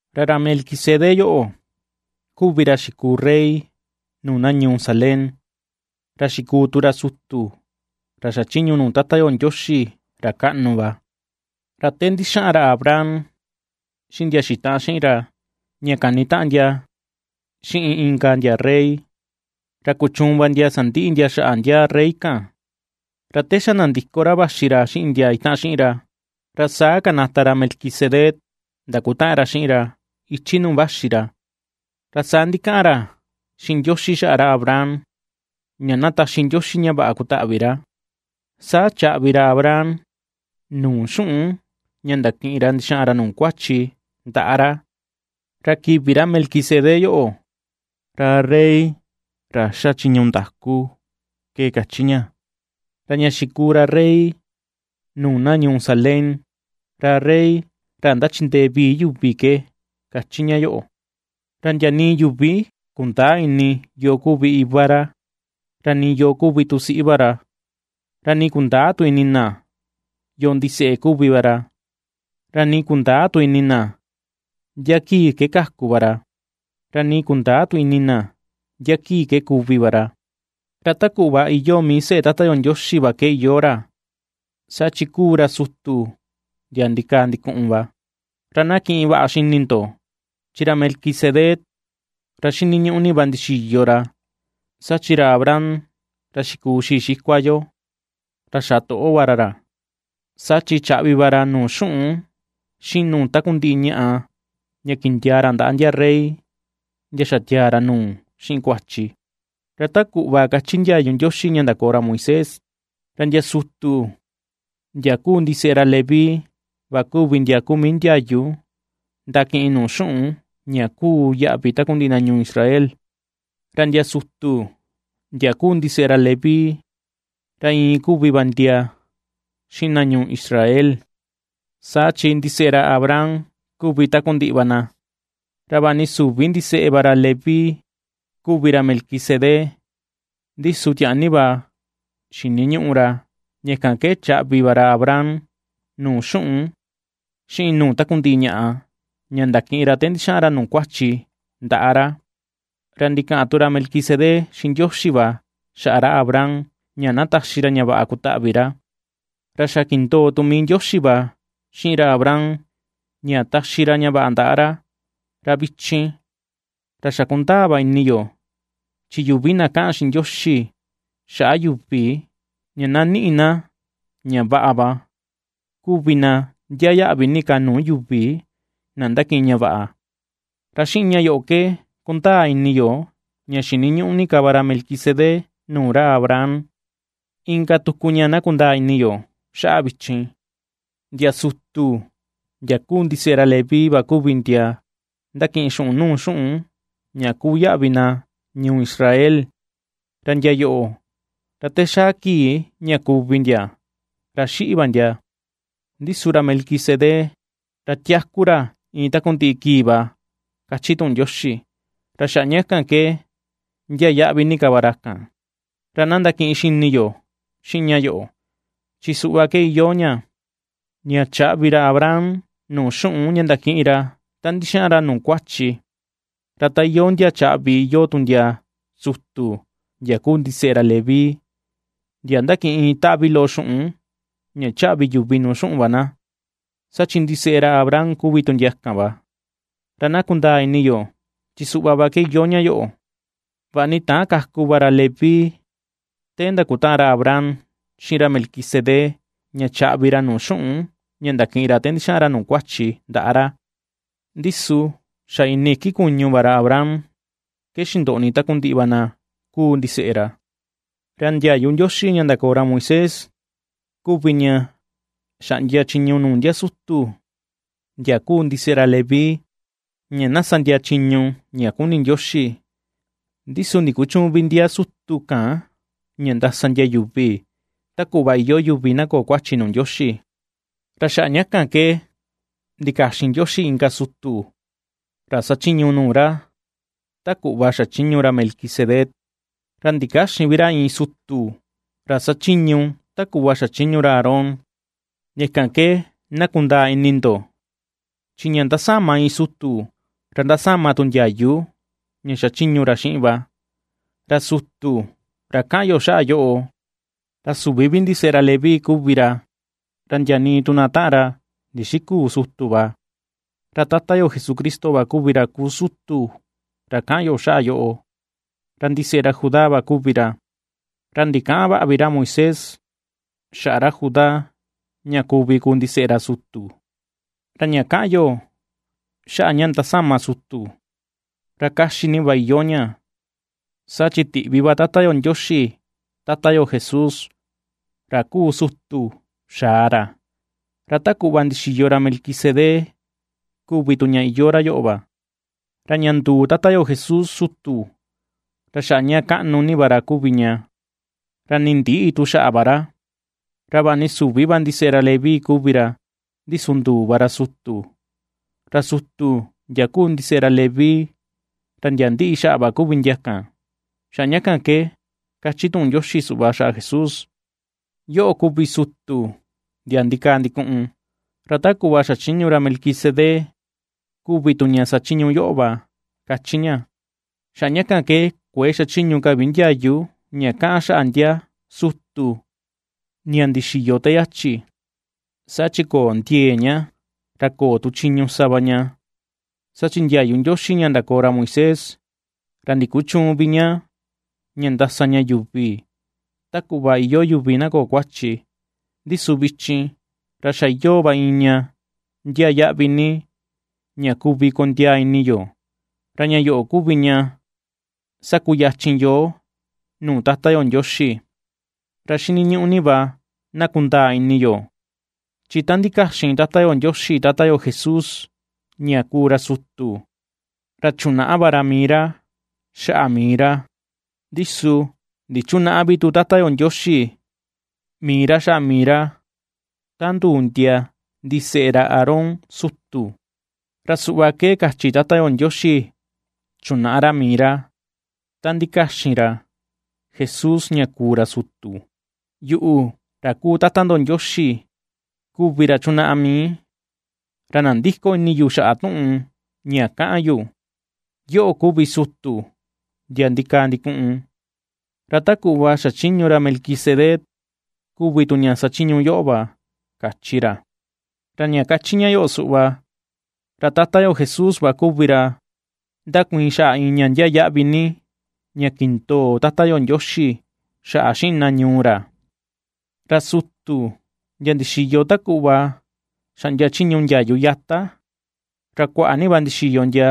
Ra ra Melquisedec yoꞌo, kuvi ra xikuu rey nuu na ñuu Salem, ra xikuu tu ra sutu ra xachiñu nuu Tata yo Ndioxi ra kaꞌnu va. Ra te ndixaꞌan ra Abraham xiꞌin ndia xitaꞌan xiꞌin ra ña kanitaꞌan ndia xiꞌin inka ndia rey, ra kuchuun va ndia sandiꞌi ndia xaꞌa ndia rey kan. Ra te xa nandiko ra vaxi ra xiꞌin ndia itaꞌan xiꞌin ra, ra saa kanata ra Melquisedec ndakutaꞌan ra xiꞌin ra ichi nuu vaxi ra, ra saa ndikaꞌan ra xiꞌin Ndioxi xaꞌa ra Abraham ña na taxi Ndioxi ña vaꞌa kutaꞌvi ra. Saa chaꞌvi ra Abraham nuu xuꞌun ña ndakiꞌin ra ndixaꞌan ra nuu kuachi, ndaꞌa ra. Ra kivi ra Melquisedec yoꞌo, “ra rey ra ^xa chiñu ndaku”, ke kachi ña; ra ña xikuu ra rey nuu na ñuu Salem, ra “rey ra ndachindee vii yuvi ke”, kachi ña yoꞌo. Ra ndia nii yuvi kundäa ini yoo kuvi iva ra, ra nii yoo kuvi tu siꞌi va ra, ra nii kundäa tu ini na yoo ndiseꞌe kuvi va ra; ra nii kundäa tu ini na ndia kii ke kaku va ra, ra nii kundäa tu ini na ndia kii ke kuvi va ra; ra ta kuꞌva iyoo mii seꞌe Tata yo Ndioxi va ke iyoo ra, saa chi kuu ra sutu ndia ndikaa ndikuꞌun va. Ra na ^kiꞌin vaꞌa xini ndo, chi ra Melquisedec ra ^xiniñuꞌu ni va ndixiyo ra, saa chi ra Abraham ra xikuu xii xikua yo, ra xa toꞌo va ra ra, saa chi chaꞌvi va ra nuu xuꞌun xiꞌin nuu takundiꞌi ñaꞌa, ña kindiaa ra ndaꞌa ndia rey ndia xatiaa ra nuu xiꞌin kuachi. Ra ta kuꞌva kachi ndiayu Ndioxi ña ndakoo ra Moisés, ra ndia sutu ndia kuu ndiseꞌe ra Leví va kuvi ndia kuu mii ndiayu ndakiꞌin nuu xuꞌun ña kuu yaꞌvi takundiꞌi na ñuu Israel, ra ndia sutu ndia kuu ndiseꞌe ra Leví, ra iin kuvi va ndia xiꞌin na ñuu Israel, saa chi ndiseꞌe ra Abraham kuvi takundiꞌi va na. Ra vaꞌa ni süvi ndiseꞌe va ra Leví kuvi ra Melquisedec, ndi su tiaa ni va xiniñuꞌu ra, ña kan ke chaꞌvi va ra Abraham nuu xuꞌun xiꞌin nuu takundiꞌi ñaꞌa ña ndakiꞌin ra te ndixaꞌan ra nuu kuachi ndaꞌa ra. Ra ndikaꞌan tu ra Melquisedec xiꞌin Ndioxi va xaꞌa ra Abraham ña na taxi ra ña vaꞌa kutaꞌvi ra, ra xa kindoo tu mii Ndioxi va xiꞌin ra Abraham ña taxi ra ña vaꞌa ndaꞌa ra. Ra vichin, ra xa kundaa va ini yo, chi yuvi na kaꞌan xiꞌin Ndioxi xaꞌa yuvi ña na niꞌi na ña vaꞌa va kuvi na ndiaa yaꞌvi ni ka nuu yuvi na ndakiꞌin ña vaꞌa. Ra xiꞌin ña yoꞌo ke kundaa ini yo ña xiniñuꞌu ni ka va ra Melquisedec nuu ra Abraham. Inka tuku ña na kundaa ini yo xaꞌa vichin, ndia sutu ndia kuu ndiseꞌe ra Leví va kuvi ndia ndakiꞌin xuꞌun nuu xuꞌun ña kuu yaꞌvi na ñuu Israel, ra ndia yoꞌo, ra te xaa kii ña kuvi ndia, ra xiꞌi va ndia; ndi su ra Melquisedec ra tiaku ra iin takundiꞌi kii va kachi tuꞌun Ndioxi, ra xaꞌa ña kan ke ndiaa yaꞌvi ni ka va ra kan. Ra na ndakiꞌin xini yo xiꞌin ña yoꞌo, chi suꞌva ke iyoo ña, ña chaꞌvi ra Abraham nuu xuꞌun ña ndakiꞌin ra ta ndixaꞌan ra nuu kuachi, ra ta iyoo ndia chaꞌvi iyoo tu ndia sutu ndia kuu ndiseꞌe ra Leví, ndia ^ndakiꞌin iin taꞌvi loꞌo xuꞌun ña chaꞌvi yuvi nuu xuꞌun va na, saa chi ndiseꞌe ra Abraham kuvi tu ndia kan va. Ra na kundaa ini yo, chi suꞌva va ke iyoo ña yoꞌo: vaꞌa ni täan kaku va ra Leví te ndakutaꞌan ra Abraham xiꞌin ra Melquisedec ña chaꞌvi ra nuu xuꞌun ña ndakiꞌin ra te ndixaꞌan ra nuu kuachi ndaꞌa ra, ndi su xa ini iki kuñu va ra Abraham ke xindoꞌni takundiꞌi va na kuu ndiseꞌe ra. Ra ndiayu Ndioxi ña ndakoo ra Moisés kuvi ña xaꞌndia chiñu nuu ndia sutu ndia kuu ndiseꞌe ra Leví ña na sa ndia chiñu ña kuni Ndioxi. Ndi su ndikuchüun vi ndia sutu kan ña ndasa ndia yuvi ta kuꞌva iyoo yuvi na köo kuachi nuu Ndioxi. Ra xaꞌa ña kan ke ndikaxin Ndioxi inka sutu ra sachiñu nuu ra ta kuꞌva xachiñu ra Melquisedec, ra ndikäxin vi ra iin sutu ra sachiñu ta kuꞌva xachiñu ra Aarón. Ña kan ke na kundaa ini ndo, chi ña ndasama iin sutu, ra ndasama tu ndiayu ña xachiñu ra xiꞌin va. Ra sutu ra kaꞌan yo xaꞌa yoꞌo, ra süvi vi ndiseꞌe ra Leví kuvi ra, ra ndia nii tu na taꞌan ra ndixiküu sutu va. Ra Tata yo Jesucristo va kuvi ra kuu sutu ra kaꞌan yo xaꞌa yoꞌo, ra ndiseꞌe ra Judá va kuvi ra, ra ndikäꞌan vaꞌa vi ra Moisés xaꞌa ra Judá ña kuvi kuu ndiseꞌe ra sutu. Ra ña kaꞌan yo xaꞌa ña ndasama sutu, ra kaxi ni va iyoo ña, saa chi tiꞌvi va Tata yo Ndioxi Tata yo Jesús, ra kuu sutu xaa ra, ra ta kuꞌva ndixiyo ra Melquisedec kuvi tu ña iyoo ra yoꞌo va. Ra ña nduu Tata yo Jesús sutu, ra xaꞌa ña kaꞌnu ni va ra kuvi ña, ra ni ndïꞌi tu xaꞌa va ra; ra vaꞌa ni süvi va ndiseꞌe ra Leví kuvi ra, ndi su nduu va ra sutu, ra sutu ndia kuu ndiseꞌe ra Leví ra ndia ^ndiꞌi xaꞌa va kuvi ndia kan. Xaꞌa ña kan ke kachi tuꞌun Ndioxi suꞌva xaꞌa Jesús: Yoꞌo kuvi sutu, ndia ndikaa ndikuꞌun, ra ta kuꞌva xachiñu ra Melquidsedec kuvi tu ña sachiñu yoꞌo va, ^kachi ña. Xaꞌa ña kan ke kuëe xachiñu ka vi ndiayu ña kaꞌan xaꞌa ndia sutu ña ndixiyo te yachi, saa chi köo ndiee ña, ra köo tu chiñu sa va ña. Saa chi ndiayu Ndioxi ña ndakoo ra Moisés, ra ndikuchüun vi ña ña ndasa ña yuvi ta kuꞌva iyoo yuvi na köo kuachi. Ndi su vichin, ra xa iyoo va iin ña ndiaa yaꞌvi ni, ña kuvi kondiaa ini yo, ra ña yoꞌo kuvi ña ^sakuyachin yoo nuu Tata yo Ndioxi. Ra xiniñuꞌu ni va na kundaa ini yo, chi ta ndikaxin Tata yo Ndioxi Tata yo Jesús, ña kuu ra sutu, ra chunaꞌa va ra mii ra xaꞌa mii ra, ndi su ndichunäꞌa vi Tata yo Ndioxi mii ra xaꞌa mii ra, ta nduu ndia ndiseꞌe ra Aarón sutu. Ra suꞌva ke kachi Tata yo Ndioxi chunaꞌa ra mii ra, ta ndikaxin ra Jesús ña kuu ra sutu: Yuꞌu, ra kuu Tata ndo Ndioxi kuvi ra chunaꞌa mii, ra nandïko ini yu xaꞌa tuꞌun ña kaꞌan yu: “Yoꞌo kuvi sutu ndia ndikaa ndikuꞌun, ra ta kuꞌva xachiñu ra Melquisedec kuvi tu ña sachiñu yoꞌo va”, kachi ra. Ra ña kachi ña yoꞌo suꞌva, ra Tata yo Jesús va kuvi ra ^ndakuiin xaꞌa iin ña ndiaa yaꞌvi ni, ña kindoo Tata yo Ndioxi xaꞌa xiꞌin na ñuu ra. Ra sutu ndia ndixiyo ta kuꞌva xaꞌndia chiñu ndiayu yata, ra kuaꞌa ni va ndixiyo ndia,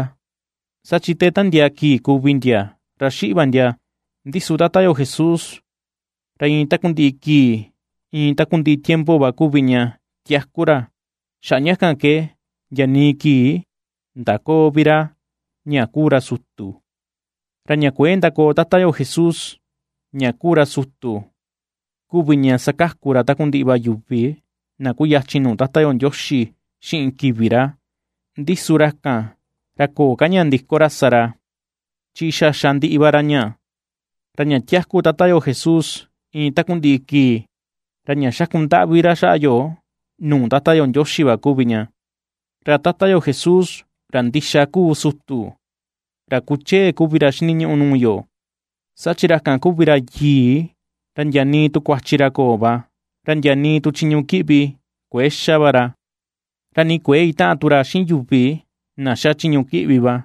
saa chi te ^tandiaa kii kuvi ndia ra xiꞌi va ndia. Ndi su Tata yo Jesús ra iin takundiꞌi kii, iin takundiꞌi tiempo va kuvi ña tiaku ra, xaꞌa ña kan ke ndia nii kii ndaköo vi ra ña kuu ra sutu. Ra ña kuëe ndakoo Tata yo Jesús, ña kuu ra sutu kuvi ña ^sakaku ra takundiꞌi va yuvi na kuyachin nuu Tata yo Ndioxi xiꞌin kivi ra. Ndi su ra kan ra köo ka ña ndiko ra sa ra, chi xa xa ndiꞌi va ra ña. Ra ña tiaku Tata yo Jesús iin takundiꞌi kii, ra ña xaku ndaꞌvi ra xaꞌa yo nuu Tata yo Ndioxi va kuvi ña. Ra Tata yo Jesús, ra ndixa kuu sutu, ra kuchee kuvi ra xiniñuꞌu nuu yo, saa chi ra kan kuvi ra yii, ra ndia nii tu kuachi ra köo va, ra ndia nii tu chiñu kiꞌvi kuëe xa va ra, ra nii kuëe itaꞌan tu ra xiꞌin yuvi na xa chiñu kiꞌvi va.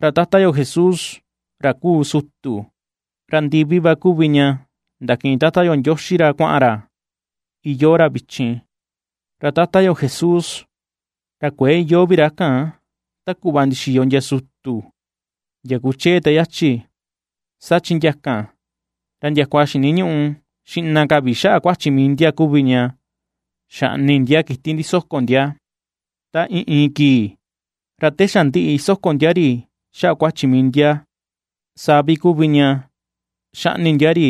Ra Tata yo Jesús ra kuu sutu, ra ndivi va kuvi ña ndakiꞌin Tata yo Ndioxi ra kuaꞌan ra iyoo ra vichin. Ra Tata yo Jesús, ra kuëe iyoo vi ra ta kuꞌva ndixiyo ndia sutu ndia kuchee te yachi, saa chi ndia kan ra ndiakua xiniñuꞌu xiꞌna ka vi xaꞌa kuachi mii ndia kuvi ña xaꞌni ndia kiti ndisoko ndia ta iin iin kii; ra te xa ndiꞌi soko ndia ri xaꞌa kuachi mii ndia, saa vi kuvi ña ^xaꞌni ndia ri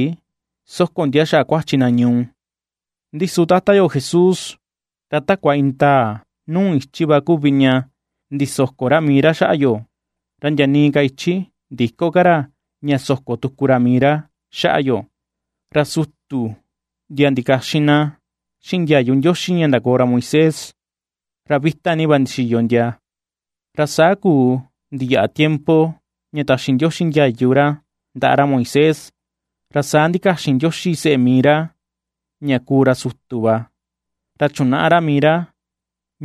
soko ndia xaꞌa kuachi na ñuu. Ndi su Tata yo Jesús, ra takua indaa nuu ichi va kuvi ña ndisoko ra mii ra xaꞌa yo, ra ndia nii ka ichi ndïko ka ra ña soko tuku ra mii ra xaꞌa yo. Ra sutu ndia ndikaxin na xiꞌin ndiayu Ndioxi ña ndakoo ra Moisés, ra vita ni va ndixiyo ndia, ra saa kuu ndiyaꞌa tiempo ña taxi Ndioxi ndiayu ra ndaꞌa ra Moisés, ra saa ndikaxin Ndioxi seꞌe mii ra ña kuu ra sutu va, ra chunaꞌa ra mii ra,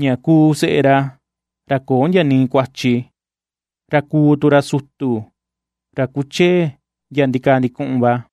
ña kuu seꞌe ra, ra köo ndia nii kuachi, ra kuu tu ra sutu ra kuchee ndia ndikaa ndikuꞌun va.